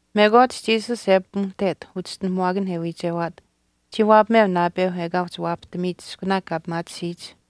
Mekwaach Jesus e pimuhtet uchischinuhamuwaakan e wiichewaat chii waapameu naapeu ekaa uhchi waapahtamiyich iskunaak kaa pimaatisiyich.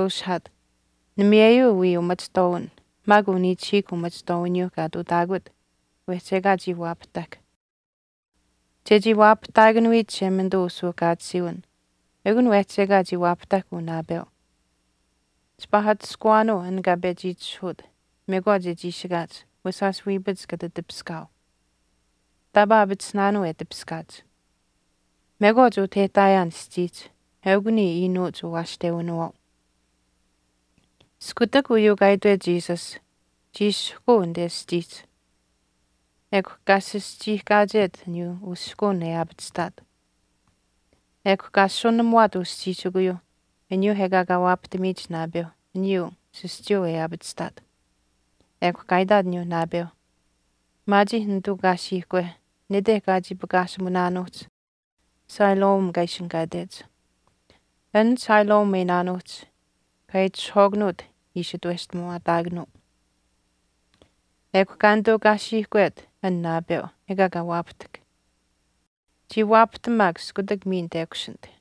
Jesus kaa nishkweushihaat, “Namiyeyuu wii umachihtwaawin maak uniichihiikw umachihtuutamuwiniyuu kaa ihtuutaakut wehchi ekaa chii waapahtahk. Chechii waapahtaakanuyich Chishemanituu usuuhkaatisiiwin ekun wehchi ekaa chii waapahtahk uu naapeu. Chipaa atushkuwaanuu an kaa pechi itishahuut mekwaach e chiishikaach wesh shaash wiipach kata tipiskaau. Taapaa aapatisinaanuu e tipiskaach. Mekwaach utah e ihtaayaan aschiihch eukw niya iinuuch uwaashtewinawaau.” Iskutak uyuu kaa itwet Jesus chii sihkuu anite aschiihch ekw kaa sischiihkaachet aniyuu usihkuun e aapachihtaat. Ekw kaa asusunamuwaat uschiishikuyuu aniyuu ekaa kaa waapahtamiyich naapeu aniyuu sischuuyuu e aapachihaat. Ekw kaa itaat aniyuu naapeu, “Maachih nituu kaasiihkwe nete kaa chii pakaashimunaanuuhch Siloam kaa ishinihkaatech.” An Siloam e iinaanuuhch “kaa itishahwaakanuut” ishi itweshtamuwaataakanuu. Ekw kaa nituu kaasiihkwe an naapeu ekaa kaa waapahtahk, chii waapahtam maak iskutak miin tekushinit.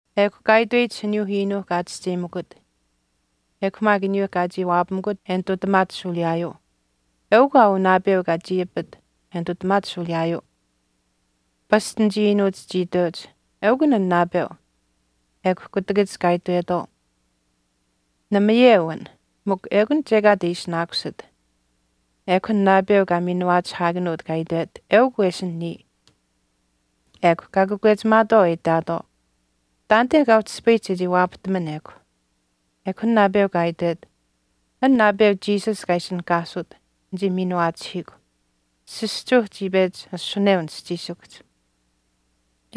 Ekw kaa itweyich aniyuu iinuu kaa chischeyimakut ekw maak aniyuu kaa chii waapamikut e nitutamaat shuuliyaayuu, “Eukw aa uu naapeu kaa chii apit e nitutamaat shuuliyaayuu.” Pasch anichii iinuuch chii iteuch, “Eukun an naapeu. Ekw kutakach kaa itwetwaau, namayeu an mikw ekun chekaat e ishinaakusit.” Ekw an naapeu kaa miinuwaachihaakanuut kaa itwet, “Eukw wesin niya.” Ekw kaa kakwechimaatwaau e itaatwaau, “Taanite kaa uhchi ispayihch chechii waapahtaman ekw.” Ekw an naapeu kaa itwet, “An naapeu Jesus kaa ishinihkaasut nichii miinuwaachihiikw. Sischuu chii pechi asuneu nischiishikuhch,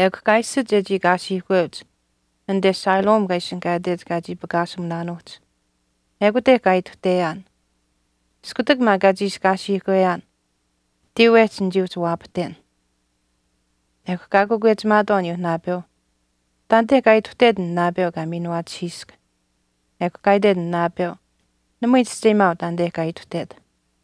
ekw kaa iishit chechii kaasiikweuch anite Siloam kaa ishinihkaatech kaa chii pakaashimunaanuuhch. Ekute kaa ituhteyaan. Iskutak maak kaa chiishi kaasiikweyaan tiiwehch nichii uhchi waapahten.” Ekw kaa kakwechimaatwaau aniyuu naapeu, “Taanite kaa ituhtet an naapeu kaa miinuwaachihiisk.” Ekw kaa itwet an naapeu, “Namui nichischeyimaau taanite kaa ituhtet.”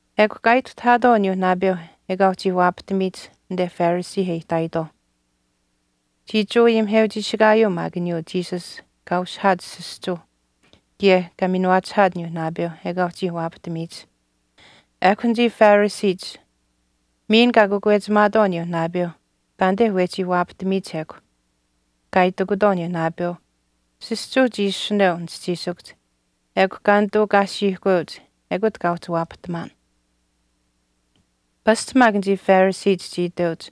Ekw kaa ituhtahaatwaau aniyuu naapeu ekaa uhchii waapahtamiyich anite Phariseeh e ihtaayitwaauh. Chii Jewa ayimiheuchiishikaayuu maak aniyuu Jesus kaa ushihaat sischuu kaye kaa miinuwaachihaat aniyuu naapeu ekaa uhchii waapahtamiyich. Ekw anichii Phariseech miin kaa kakwechimaatwaau aniyuu naapeu taanite wehchii waapahtamiyich ekw. Kaa itikutwaau aniyuu naapeu, “Sischuu chii asuneu nischiisikuhch ekw kaa nituu kaasiikweuch ekut kaa uhchi waapahtamaan.” Pasch maak anichii Phariseech chii iteuch,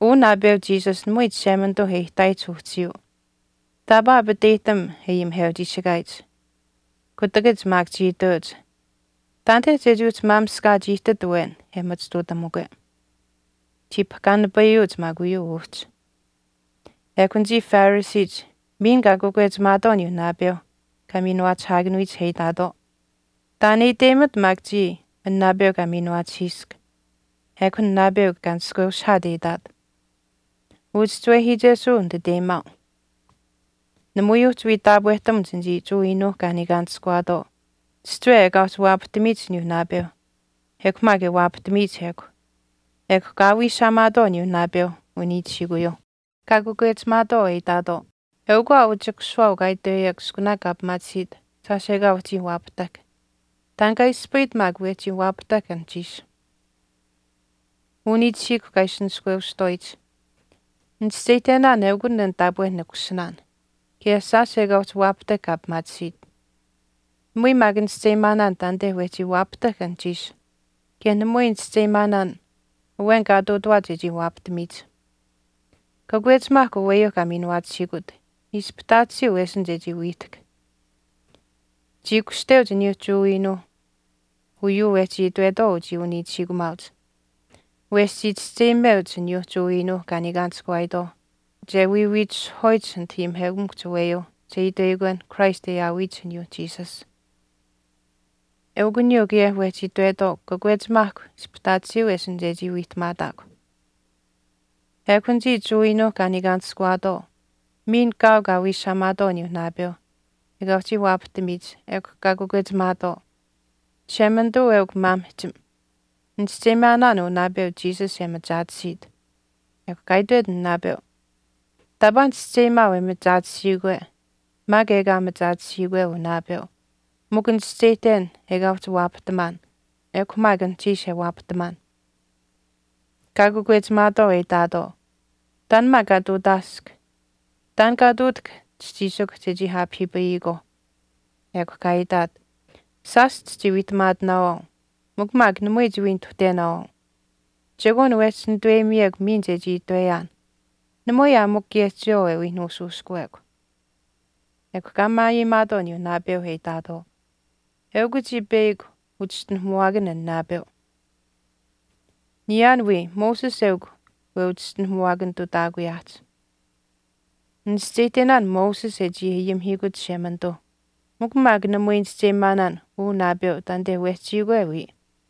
“Uu naapeu Jesus namui Chishemanituu e ihtaayich uhchiyuu, taapaa aapateyihtam e Jewa ayimiheuchiishikaayich.” Kutakach maak chii iteuch, “Taanite chechii uhchi maamishkaach ihtit awen e machituutamukwe. Chii pahkaanipayuuch maak uyuu uhchi.” Ekw anichii Phariseech miin kaa kakwechimaatwaau aniyuu naapeu kaa miinuwaachihaakanuyich e itaatwaau, “Taan e iteyimat maak chiya an naapeu kaa miinuwaachihiisk.” Ekw an naapeu kaa nishkweushihaat e itaat, “Uchischiwehiichesuu nititeyimaau.” Namui uhchi wii taapwehtamuch anichii Jewa iinuuh kaa niikaanishkuwaatwaau chihchiwe ekaa uhchi waapahtamiyich aniyuu naapeu ekw maak e waapahtamiyich ekw. Ekw kaa wiishaamaatwaau aniyuu naapeu uniichihiikuyuu, kaa kakwechimaatwaau e itaatwaau, “Eukw aa uu chikusiwaau kaa itweyekw iskunaak kaa pimaatisiit shaash ekaa uhchii waapahtahk. Taan kaa ispayit maak wehchii waapahtahk anuhchiish.” Uniichihiikw kaa ishi nishkweushihtwaayich, “Nichischeyihtenaan eukun an taapwe nikusinaan, kaye shaash ekaa uhchi waapahtahk kaa pimaatisiit. Namui maak nichischeyimaanaan taanite wehchii waapahtahk anuhchiish, kaye namui nichischeyimaanaan awen kaa ihtuutuwaat chechii waapahtamiyich. Kakwechimaahkw aweyuu kaa miinuwaachihiikut, ispihtaatisiyuu wesin chechii wiihtahk.” Chii kushteuch aniyuu Jewa iinuu uyuu wehchii itwetwaau uchii uniichihiikumaauch. Wesh chii chischeyimeuch aniyuu Jewa iinuuh kaa niikaanishkuwaayitwaauh che wiiwiitishihwaayich anit ayimiheukamikuhch aweyuu che itweyikwen Christ e aawiyich aniyuu Jesus. Eukw aniyuu kaye wehchi itwetwaau “Kakwechimaahk, ispihtaatisiyuu wesin chechii wiihtamaataakw.” Ekw anichii Jewa iinuuh kaa niikaanishkuwaatwaau miin kaau kaa wiishaamaatwaau aniyuu naapeu ekaa uhchii waapahtamiyich ekw kaa kakwechimaatwaau, “Chishemanituu eukw maamihchim. Nichischeyimaanaan uu naapeu Jesus e machaatisiit.” Ekw kaa itwet an naapeu, “Taapaa nichischeyimaau e machaatisiikwe maak ekaa machaatisiikwe uu naapeu mikw nichischeyihten ekaa uhchi waapahtamaan ekw maak anuhchiish e waapahtamaan.” Kaa kakwechimaatwaau e itaatwaau, “Taan maak kaa ihtuutaask. Taan kaa ihtuutahk chischiishikw chechii aapahiipayikwaauh.” Ekw kaa itaat, “Shaash chichii wiihtamaatinaawaau mikw maak namui chiwii nituhtenaawaau. Chekwaan wehchi nituweyimiyekw miin chechii itweyaan. Namui aa mikw kaye chiyawaau e wii nuushuushkuwekw.” Ekw kaa maayeyimaatwaau aniyuu naapeu e itaatwaau, “Eukw chiya peyakw uchischinuhamuwaakanh an naapeu, niyaan wii Moses eukw weuchischinuhamuwaakanitutaakuyaahch. Nichischeyihtenaan Moses e chii ayimihiikut Chishemanituu, mikw maak namui nichischeyimaanaan uu naapeu taanite wehchiikwe wiya.”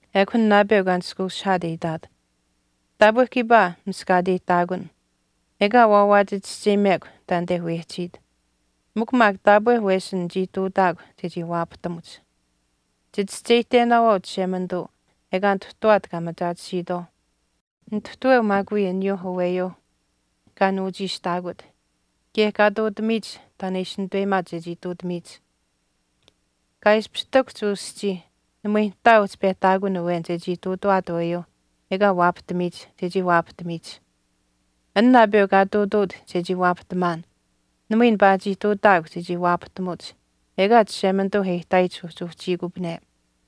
Ekw an naapeu kaa nishkweushihaat e itaat, “Taapwe kiipaa miskaateyihtaakun, ekaa waawaach chischeyimekw taanite wehchiit, mikw maak taapwe wesin nichii ihtuutaakw chechii waapahtamuch. Chichischeyihtenaanuu Chishemanituu ekaa nituhtuwaat kaa machaatisiitwaauh, nituhtaweu maak wiya aniyuu aweyuu kaa nuuchiishtaakut kaye kaa ihtuutamiyich taan e ishi nituweyimaat chechii ihtuutamiyich. Kaa ishpish ihtakuhch uu aschii, namui nihtaa uhchi pehtaakun awen chechii ihtuutuwaat aweyuu ekaa waapahtamiyich chechii waapahtamiyich. An naapeu kaa ihtuutuut chechii waapahtamaan namui nipaachii ihtuutaakw chechii waapahtamuch ekaa Chishemanituu e ihtaayich uhchi uhchiikupane.”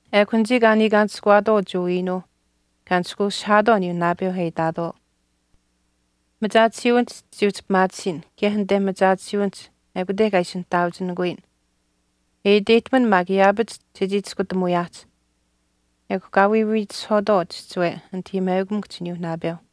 Ekw anichii kaa niikaanishkuwaatwaau Jewa iinuuh kaa nishkweushihaatwaau aniyuu naapeu e itaatwaau, “Machaatisiiwinihch chichii uhchi pimaatisiin kaye anite machaatisiiwinihch ekute kaa ishi nihtaauchinikuyin, e iteyihtaman maak yaapach chechii chiskutamuuyaahch.” Ekw kaa wiiwiitishihwaatwaau chihchiwe anit ayimiheukamikuhch aniyuu naapeu.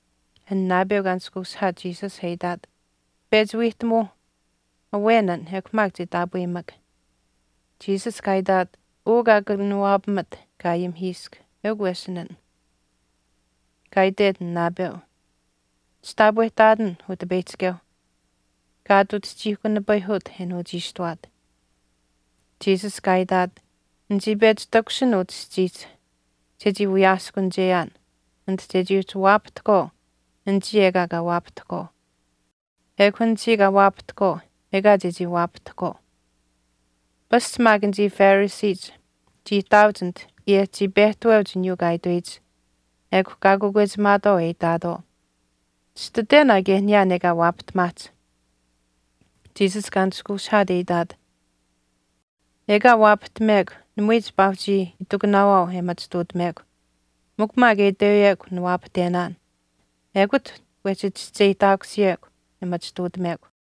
An naapeu kaa nishkweushihaat Jesus e itaat, “Pechi wiihtamuu awen an ekw maak che taapweyimak.” Jesus kaa itaat, “Uu kaa kanawaapamat kaa ayimihiisk, eukw wesin an.” Kaa itwet an naapeu, “Chitaapwehtaatin Utipeyihchikeu.” Kaa ati uchihchiihkunipit e nuuchiishtuwaat. Jesus kaa itaat, “Nichii pechi takushin utah aschiihch chechii wiyaaskunicheyaan anit chechii uhchi waapahtahkwaau anichii ekaa kaa waapahtahkwaau, ekw anichii kaa waapahtahkwaau ekaa chechii waapahtahkwaau.” Pasch maak anichii Phariseech chii ihtaauch anit kaye chii pehtaweuch aniyuu kaa itweyich ekw kaa kakwechimaatwaau e itaatwaau, “Chititwen aa kaye niyaan ekaa waapahtamaahch.” Jesus kaa nishkweushihaat e itaat, “Ekaa waapahtamekw namui chipaa uhchii itikunaawaau e machituutamekw, mikw maak e itweyekw niwaapahtenaan, ekut wehchi chischeyihtaakusiyekw e machituutamekw.”